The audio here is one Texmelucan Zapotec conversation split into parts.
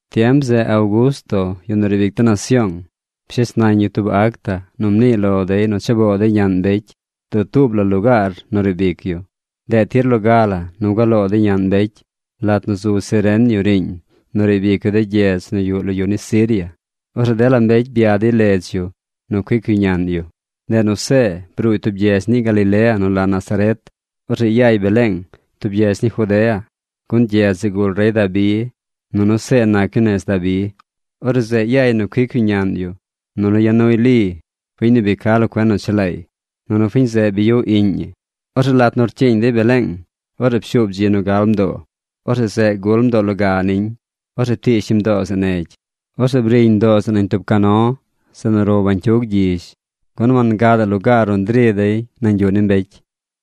Tiem zeꞌ Augusto, yu nu riib ic de nasyoong, pshes nañ yu tub acta nu mniiy lo dey nu cha boo dey ñaꞌn mbecy dutuub la lugaar nu riib ic yu. Ndeꞌ tir loga la gua loo dey ñaꞌn mbecy lat nu zu Cirenio riiñ nu riib ic yu de gyedz nu yuꞌ lo yu ni Siria. Orzeꞌ dela mbecy bya dey ledz yu nu cuic yu ñaꞌn yu. Ndeꞌ nu See bruuy tub gyedz ni Galilea nu la Nazaret. Orzeꞌ yay Beleeng, tub gyedz ni Judea, gun gyedz zeꞌ gul rey Dabi, nunu See nac yu nez Dabi. Orzeꞌ zeꞌ yay nu cuic yu ñaꞌn yu. Nunu ya nuy Li, fiñ nu bi ca lo cuen nu chelaay. Nunu fiñ zeꞌ bi yuꞌ iꞌñ ñi. Orzeꞌ lat nu rcyiiñ dey Beleeng, orzeꞌ pshuub dzi nu gal mdoo. Orzeꞌ zeꞌ gul mdoo loga niñ. Orzeꞌ ptiish ñi mdoo zeꞌ negy. Orzeꞌ briñ mdoo zeꞌ nañ tub cano, zeꞌ nu row bañcyug gyizh, gun wangadaꞌ lugaar nu ndri dey nañ yuꞌ ni mbecy.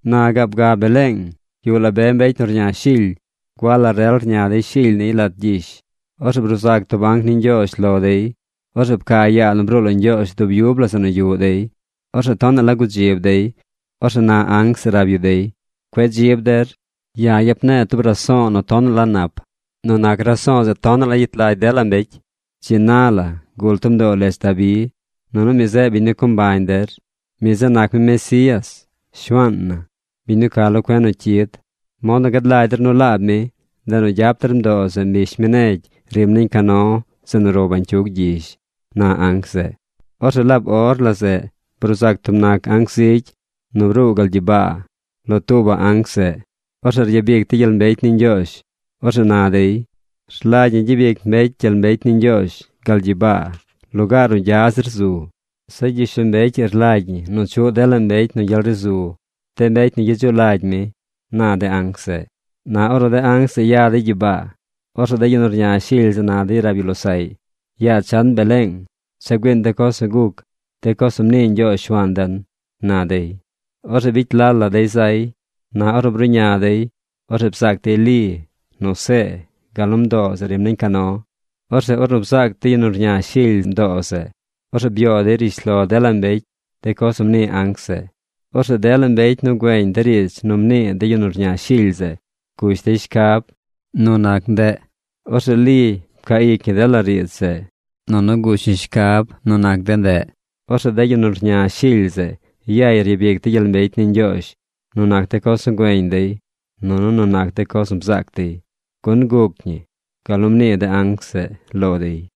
Na gaab ga Beleeng yuꞌ la be mbecy nu rña shily. Gua la rel rña dey shily niy lat gyish. Orzeꞌ bruu zac tub anc ni Ñgyoozh lo dey. Orzeꞌ pca yaa nu bruu lo Ñgyoozh dub yub la zeꞌ nu yuꞌ dey. Orzeꞌ tonaꞌ la gudzib dey. Orzeꞌ na anc zeꞌ rab yu dey: ―Cueꞌ dzib der. Ya̱ yap ne̱e̱ tub riidz nu tonaꞌ la nap. Nu nac riidz zeꞌ tonaꞌ la gyet lagy dela mbecy. Dzi na la gul tub mdoo ledz Dabi. Nunu mi zeꞌ biñ nu co mbañ der. Mi zeꞌ nac mi Mesías, Shuaan na, biñ nu ca lo cuen nu cyid. Mod nu gad lagy der nu laab mi, ndeꞌ nu gyap der mdoo zeꞌ mbish mi negy rim nañ cano zeꞌ nu row bañcyug gyizh ―na anc zeꞌ. Orzeꞌ laab or la zeꞌ bruu zac tub nac anc zigy nu bruu gal gyibaa lo tuubaꞌ anc zeꞌ. Orzeꞌ ryabic dey gyel mbecy ni Ñgyoozh. Orzeꞌ na dey: Rlagy ñi gyabic mbecy gyel mbecy ni Ñgyoozh gal gyibaa lugaar nu gya zir zu. Zeꞌ gyishlombecy ii rlagy ñi nu chuꞌ dela mbecy nu gyel ri zu, de mbecy nu gyedzuꞌ lagy mi, na de anc zeꞌ. Na ornu de anc zeꞌ ya dey gyibaa, orzeꞌ de yu rña shily zeꞌ na dey rab yu losaꞌy: ―Yaa chan Beleeng, cha güiiñ de coz nu guc, de coz nu mnii Ñgyoozh Shuaan den ―na dey. Orzeꞌ bicy lal la dey zay. Na ornu bruꞌña dey, orzeꞌ bzaac dey Li, nu See, gal nu mdoo zeꞌ rim nañ cano. Orzeꞌ ornu bzaac de yu nu rña shily zeꞌ mdoo zeꞌ, orzeꞌ byoo dey rishlo dela mbecy de coz nu mnii anc zeꞌ. Orzeꞌ dela mbecy nu güeñ riidz nu mnii de yu nu rña shily zeꞌ gush dey shcab nu nac ñii. Orzeꞌ Li pcaa ic ñi dela riidz zeꞌ nunu gush ñi shcab nu nac ñii. Orzeꞌ de yu nu rña shily zeꞌ yay ryabic dey gyel mbecy ni Ñgyoozh nu nac de coz nu güeñ dey nunu nu nac de coz nu bzaac dey. Gun guc ñi gal nu mnii de anc zeꞌ lo dey.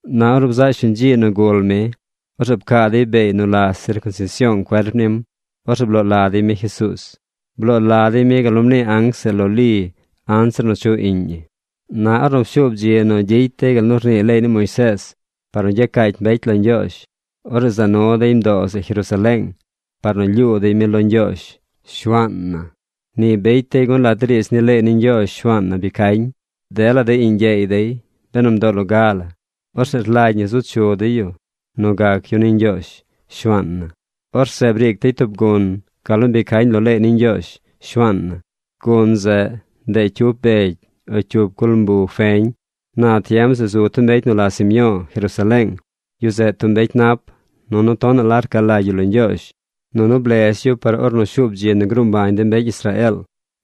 Na ornu bzaꞌ shuñ dzi nu gul mi, orzeꞌ pcaa dey beey nu la sircunsision cuerp nim. Orzeꞌ bloo la dey mi Jesuuz. Bloo la dey mi gal nu mnii anc zeꞌ lo Li anzir nu chuꞌ iꞌñ ñi. Na ornu pshuub dzi nu gyicy dey gal nu rnii leey ni Moisees par nu gyacaacy mbecy lo Ñgyoozh, orzeꞌ za nu dey mdoo zeꞌ Jerusaleeng par nu lyuu dey mi lo Ñgyoozh, Shuaan na. Ni bicy dey gun lat de riidz ni leey ni Ñgyoozh Shuaan na bi cañ: “Dela de iꞌñ gyeey dey, benu mdoo loga la, orzeꞌ rlagy ñi zu chu dey yu nu gac yu ni Ñgyoozh, Shuaan na.” Orzeꞌ briic dey tub gun gal nu bi cañ lo leey ni Ñgyoozh, Shuaan na. Gun zeꞌ, ndeꞌ cyup begy o cyup culmbu feñ. Na tiem zeꞌ zu tub mbecy nu la Simyo̱o̱ Jerusaleeng. Yu zeꞌ tub mbecy nap, nunu tonaꞌ la rca lagy yu lo Ñgyoozh, nunu blez yu par ornu shuub dzi nu gruu mbañ de mbecy Israeel.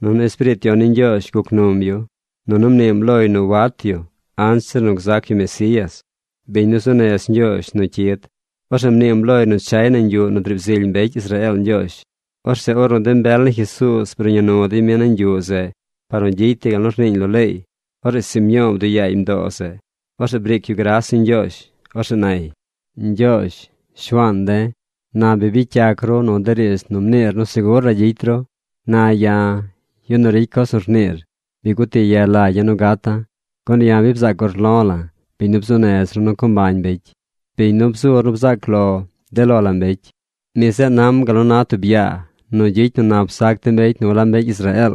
Nunu Espiriit Yon ni Ñgyoozh guc num yu, nunu mniim loy nu wat yu anzir nu gzac yu Mesías, biñ nu zuu nez Ñgyoozh nu cyid. Orzeꞌ mniim loy nu chay nañ yuꞌ nu driib zily mbecy Israeel Ñgyoozh. Orzeꞌ ornu de mbel ni Jesuuz bruꞌña nu dey mi nañ yuꞌ zeꞌ par nu gyicy dey gal nu rniiñ lo leey, orzeꞌ Simyo̱o̱ bduꞌ yaay mdoo zeꞌ. Orzeꞌ briic yu gras ni Ñgyoozh. Orzeꞌ nay: Ñgyoozh, Shuaan de̱, na bi bicy yac ru nu de riidz nu mniir nu segur la gyicy ru. Na ya̱, yu nu ricy coz nu rniir, bi guti ye lagya̱ nu gata̱. Gun ya̱ bi bzaac urlo̱ la̱ biñ nu bzuu nez ru nu co mbañ mbecy, biñ nu bzur nu bzaac lo de lo la mbecy. Mi zeꞌ nam gal nu na tub yaa nu gyicy nu nap zac de mbecy nu walab mbecy Israeel.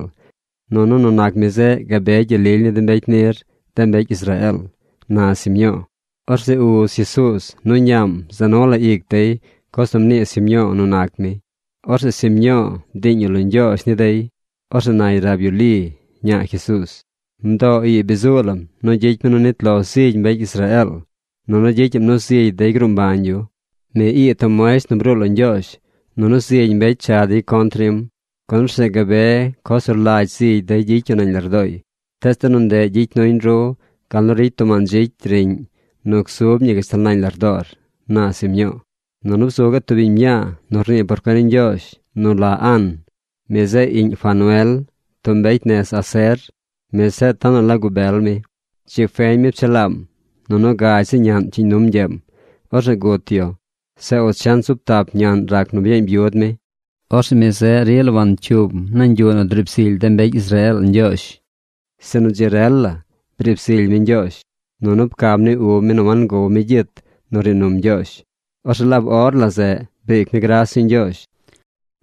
Nunu nu nac mi zeꞌ gabe gyel lily ni de mbecy nir, de mbecy Israeel, na Simyo̱o̱. Orzeꞌ uz Jesuuz nu ñaam za nu la ic dey coz nu mnii Simyo̱o̱ nu nac mi. Orzeꞌ Simyo̱o̱ bdiiñ yu lo Ñgyoozh ni dey. Orzeꞌ nay rab yu Li, ñaa Jesuuz: ―Mdoo ii bi zuu lam nu gyicy mi nu nit lo zigy mbecy Israeel nunu gyicyaꞌm nu zigy dey gruu mbañ yu. Mi ii tub muesht nu bruu lo Ñgyoozh. Nunu zigy mbecy cha dey contr nim. Gun orzeꞌ gabe coz nu rlagy zigy dey gyicy yu nañ lardooy. Tees de nu ndeꞌ gyicy nuñ ru gal nu ricy tub mandzicy riꞌñ nu gzub ñi gashtal nañ lardoor ―na Simyo̱o̱. Nunu bzu gaꞌ tub biñ mñaa nu rnii por cuen ni Ñgyoozh nu la An. Mi zeꞌ iꞌñ Fanuel, tub mbecy nez Aser. Mi zeꞌ tonaꞌ la gubel mi. Dzi feñ mi pchelaam. Nunu gagy zi ñaꞌn pcyiiñ num ñgyeem. Orzeꞌ gut yu. Zeꞌ ochent zub tap ñaꞌn rac nu byeeñ byud mi. Orzeꞌ mi zeꞌ rila wancyuum nañ yuꞌ nu driib zily de mbecy Israeel Ñgyoozh. Sinu dzi rel la briib zily mi Ñgyoozh. Nunu pcam ni ub mi nu wangow mi gyit nu rnii num Ñgyoozh. Orzeꞌ laab or la zeꞌ briic mi gras ni Ñgyoozh.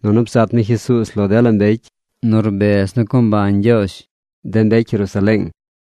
Nunu bzat mi Jesuuz lo dela mbecy nu rbez nu co mbañ Ñgyoozh de mbecy Jerusaleeng.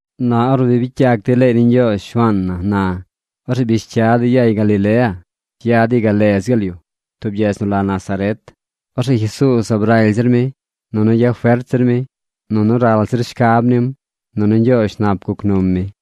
Na ornu bi bicy yac dey leey ni Ñgyoozh Shuaan na na, orzeꞌ bish cya dey yay Galilea. Ya dey gal ledz gaal yu, tub gyedz nu la Nazaret. Orzeꞌ Jesuuz zaab raly zir mi, nunu yafert zir mi, nunu ral zir shcab nim. Nunu Ñgyoozh nap guc num mi.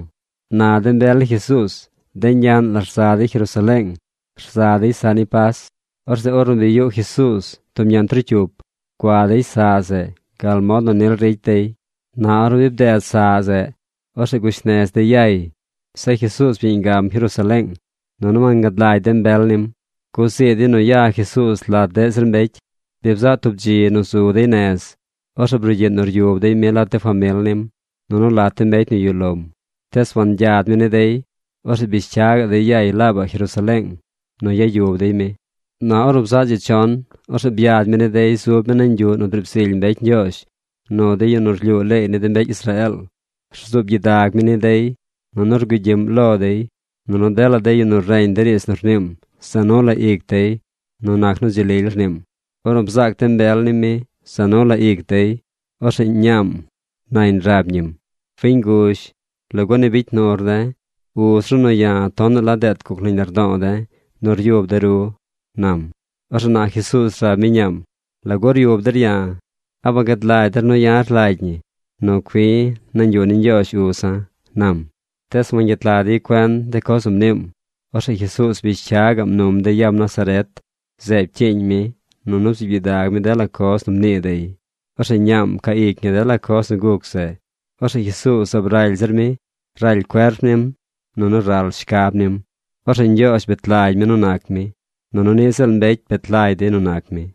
Na de mbel ni Jesuuz de ñaꞌn la rza dey Jerusaleeng rza dey saꞌ ni Pas. Orzeꞌ ornu bi yuꞌ Jesuuz tub ñaꞌn trocyup, gua dey saꞌ zeꞌ gal mod nu nil ricy dey. Na ornu bi bded saꞌ zeꞌ, orzeꞌ gush nez dey yay. Zeꞌ Jesuuz byeeñ gam Jerusaleeng. Nunu wangad lagy de mbel nim. Guzii dey nu ya Jesuuz lat deꞌ zir mbecy. Bi bzaꞌ tub dzi nu zu dey nez. Orzeꞌ brugyiꞌ nu ryub dey mi lat de famil nim, nunu lat de mbecy nu yuꞌ lom. Tees wangyad mi ni dey. Orzeꞌ bish cya gaꞌ dey yay laabaꞌ Jerusaleeng nu yub dey mi. Na ornu bzaꞌ dzi chon, orzeꞌ byad mi ni dey zub mi nañ yuꞌ nu driib zily mbecy Ñgyoozh nu de yu nu rlyuu leey ni de mbecy Israeel. Rzuub gyidag mi ni dey, nunu rgugyiꞌm lo dey. Nunu dela de yu nu reñ de riidz nu rniim za nu la ic dey nu nac nu dzi lily rniim. Ornu bzaac de mbel nim mi, za nu la ic dey. Orzeꞌ ñaam nañ rab ñim: ―Fiñ nguzh, ¿lagu ni bicy nur de̱? Uz ru nu ya̱ tonaꞌ la deet guc nañ lardo̱o̱ de̱ nu ryub de̱ ru ―nam. Orzeꞌ na Jesuuz rab mi ñaam: ―¿Lagu ryub der ya̱? ¿A wagad lagy der nu ya̱ rlagy ñi nu cui̱ nañ yuꞌ ni Ñgyoozh uza̱? ―nam. Tees wangyet lag dey cuen de coz nu mniim. Orzeꞌ Jesuuz bish cya gaꞌm num dey yam Nazaret. Zeꞌ pcyiiñ mi nunu bzuub gyidag mi dela coz nu mnii dey. Orzeꞌ ñaam pcaa ic ñi dela coz nu guc zeꞌ. Orzeꞌ Jesuuz zaab raly zir mi. Raly cuerp nim, nunu ral shcab nim. Orzeꞌ Ñgyoozh bet lagy mi nu nac mi, nunu niꞌ ziꞌl mbecy bet lagy dey nu nac mi.